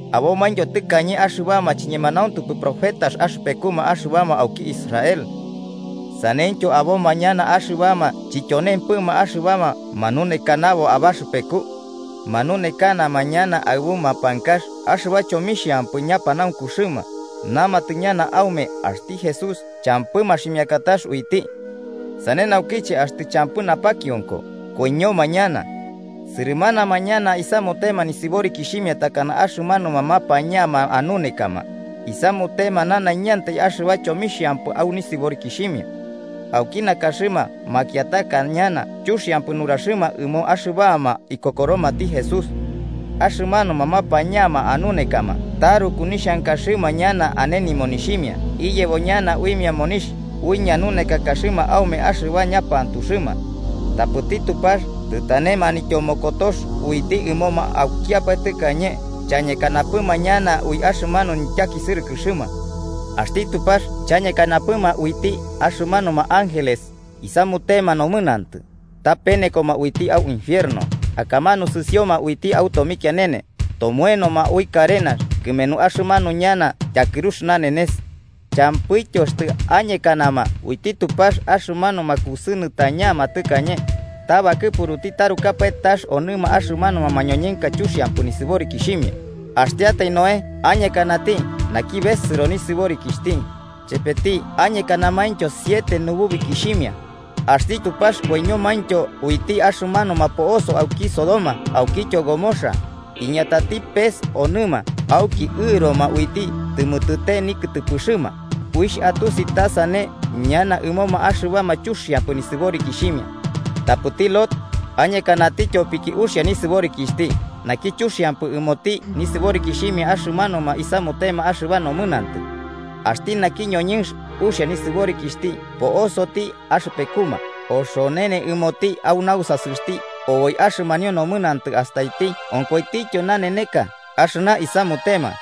Abomaintyo tɨkañe axɨbama chiñemanauntupɨ profetas axɨpekuma axɨbama auki Israel. Saneityo aboma ñana axɨbama chityonempɨma axɨbama manunekanabo abaxɨpeku. Manunekanama ñana aɨbu mapankax axɨba chomixhampɨ ñapanaunkuxɨma, namatɨ ñana aume axti Jesús champɨ maximiakatax uiti. Sane naukiche, axtɨ champɨ napakionko, koiñoma ñana. Sɨrɨmanama ñana isamutema nisɨborikixhimia takana axɨmanuma mapañama anunekama, isamutema nanaiñantai axɨba chomixhampɨ au nisɨborikixhimia. Auki nakaxɨma makiataka ñana chuxiampɨ nuraxɨma ɨmoma axɨbama ikokoromati Jesús. Axɨmanuma mapañama anunekama taruku nixhankaxɨma ñana ane nimonixhimia iyebo ñana uimia monixh ui ñanunekakaxɨma aume axɨba ñapantuxɨma. Tapɨti Tupax tɨtane manityomokotox uiti ɨmoma aukiapae tɨkañe chañekanapɨma ñana ui axɨmanu nityakisɨrɨkɨxɨma. Axti Tupax chañekanapɨma uiti axɨmanuma ángeles isamutema nomɨnantɨ, ta penekoma uiti au infierno akamanu sɨsioma uiti au tomikianene, tomoenoma ui karenax kɨmenu axɨmanu ñana tyakɨrux nanenes. Champɨityo axtɨ añekanama uiti Tupax axɨmanuma kusɨnɨtañama tɨkañe, ta bakɨpuruti tarukapae tax onɨma axɨmanuma mañoñɨnka chuxiampɨ nisɨborikixhimia, axtiatai Noé añekanati, naki besɨro nisɨborikixhti, chepeti añekanamaintyo siete nububikixhimia. Axti Tupax koiñomaintyo uiti axɨmanuma po'osoma auki Sodoma aukityo Gomorra, iñatati pes onɨma auki ɨroma uiti tɨmɨtɨte nikɨtɨpɨxɨma, uixh atusi ta sane ñana ɨmoma axɨbama chuxiampɨ nisɨborikixhimia. Tapɨti Lot, añekanati tyopiki uxia nisɨborikixhti naki chuxiampɨ ɨmoti nisɨborikixhimia axɨmanuma isamutema axɨba nomɨnantɨ. Axti naki ñoñɨnx uxia nisɨborikixhti po'osoti axɨpekuma oxonene ɨmoti au nausasɨxti oboi axɨmanio nomɨnantɨ astaiti onkoitityo naneneka axɨna isamutema.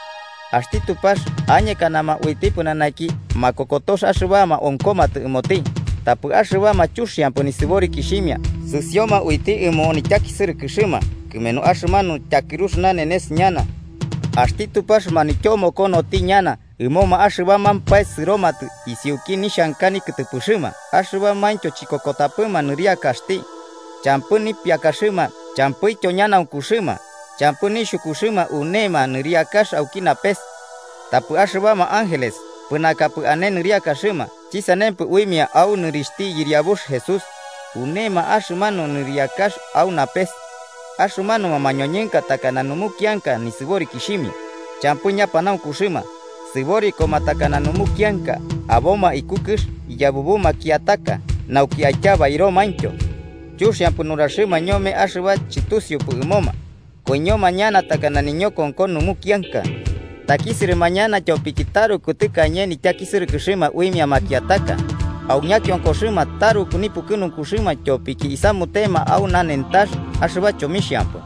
Axti Tupax añekanama uiti pɨnanaki makokotox axɨbama onkomatɨ ɨmoti, tapɨ axɨbama chuxiampɨ nisɨborikixhimia sɨsioma uiti ɨmo nityakisɨrɨkɨxɨma kɨmenu axɨmanu tyakɨrux nanenes ñana. Axti Tupax manityomokonoti ñana ɨmoma axɨbamampae sɨromatɨ isiuki nixhanka nikɨtɨpɨxɨma axɨbamaintyo chikokotapɨma nɨriakaxti. Champɨ nipiakaxɨma champɨityo ñanaunkuxɨma, champɨ nixhukuxɨma unema nɨriakax auki napes. Tapɨ axɨbama ángeles, pɨnakapɨ ane nɨriakaxɨma, chɨsanempɨ uimia au nɨrixhti Yɨriabux Jesús, unema axɨmanu nɨriakax au napes. Axɨmanuma mañoñɨnka takana numukianka nisɨborikixhimia: champɨ ñapanaunkuxɨma, sɨborikoma takana numukianka aboma iku kɨx iyabubu makiataka nauki aityabairomaintyo. Chuxiampɨ nuraxɨma ñome axɨba chɨtusiupɨ ɨmoma. Koiñoma ñana takana niñokonko numukianka, takisɨrɨma ñana tyopiki taruku tɨkañe nityakisɨrɨma uimia makiataka, au ñakionkoxɨma taruku nipukɨnunkuxɨma tyopiki isamutema au nanentax axɨba chomixhampɨ.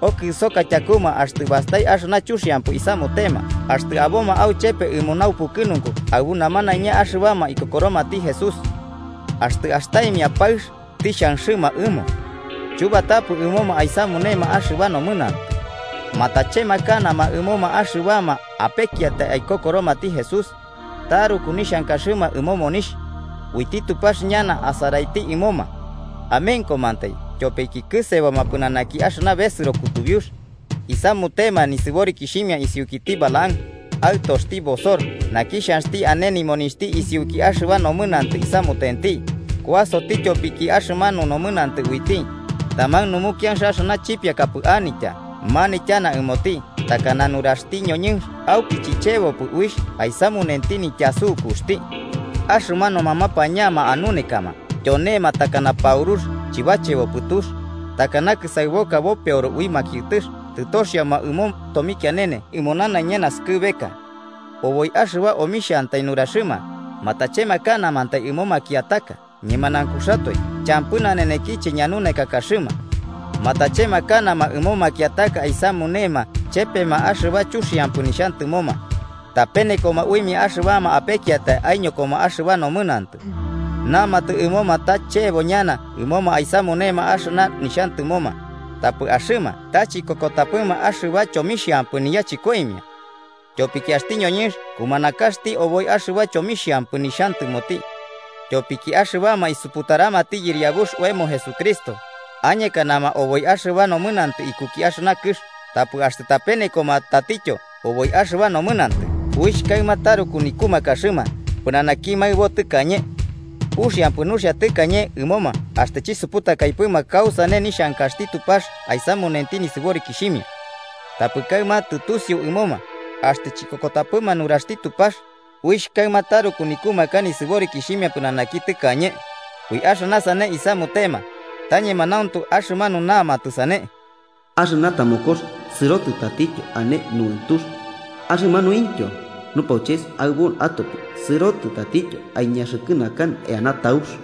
Okɨsoka tyakuma axtɨ bastai axɨna chuxiampɨ isamutema axtɨ aboma auchepe ɨmo naupukɨnunku aɨbu namanaiña axɨbama ikokoromati Jesús. Axtɨ astaimia paɨx tixhanxɨma ɨmo. Chubatapɨ ɨmoma aisamunema axɨba nomɨnantɨ. Matachemakanama ɨmoma axɨbama apekiatai aikokoromati Jesús. Taruku nixhankaxɨma ɨmo monixh. Uiti Tupax ñana asaraiti ɨmoma. Amenkomantai, tyopiki kɨseboma pɨnanaki axɨna besɨro kutubiux. Isamutema nisɨborikixhimia isiukiti Balaam, aɨtoxti Bosor, naki xhanxti ane nimonixhti isiuki axɨba nomɨnantɨ isamutenti kuasoti tyopiki axɨmanu nomɨnantɨ uiti: taman numukianx axɨna chipiakapɨ anitya manityana ɨmoti takana nuraxti ñoñɨnx auki chichebopɨ uixh aisamunenti nityasukuxti. Axɨmanuma mañapanka anunekama tyonema takana paurux chɨbachebopɨ tux, takana kɨsaɨboka bopeoro ui makiɨtɨx. Tɨtoxioma ɨmo tomikianene ɨmo nanaiña naskɨbeka. Oboi axɨba omixhantai nuraxɨma, matachemakanama ɨmo makiataka, ñemanaunkuxatoe champɨ nanenekiche ñanunekakaxɨma. Matachemakanama ɨmo makiataka aisamunema chepema axɨba chuxiampɨ nixhantɨmoma. Tapenekoma uimia axɨbama apekiatai aiñokoma axɨba nomɨnantɨ. Namatɨ ɨmoma ta chebo ñana ɨmoma aisamunema axɨna nixhantɨmoma, tapɨ axɨma ta chiñokotapɨma axɨba chomixhampɨ niyachɨkoimia. Tyopiki axti ñoñɨnx kumanakaxti oboi axɨba chomixhampɨ nixhantɨmoti. Tyopiki axɨbama isuputaramati Yɨriabux oemo Jesucristo, añekanama oboi axɨba nomɨnantɨ ikuki axɨna kɨx, tapɨ axtɨ tapenekoma tatityo oboi axɨba nomɨnantɨ uixh kaɨma taruku nikumakaxɨma pɨnanaki maɨbo tɨkañe. Uxiampɨ nuxia tɨkañe ɨmoma axtɨ chɨsuputakaipɨma kasane nixhankaxti Tupax aisamunenti nisɨborikixhimia. Tapɨ kaɨma tɨtusiu ɨmoma, axtɨ chikokotapɨma nuraxti Tupax, uixh kaɨma taruku nikumaka nisɨborikixhimia pɨnanaki tɨkañe. Ui axɨna sane isamutema, ta ñemanauntu axɨmanu namatɨ sane: “Axɨna tamokox sɨrotɨ tatityo ane nuɨntux”, axɨmanuintyo “Axɨmanu nupauches aɨbo atopi sɨrotɨ tatityo aiñaxɨkɨnakanɨ eana taux.”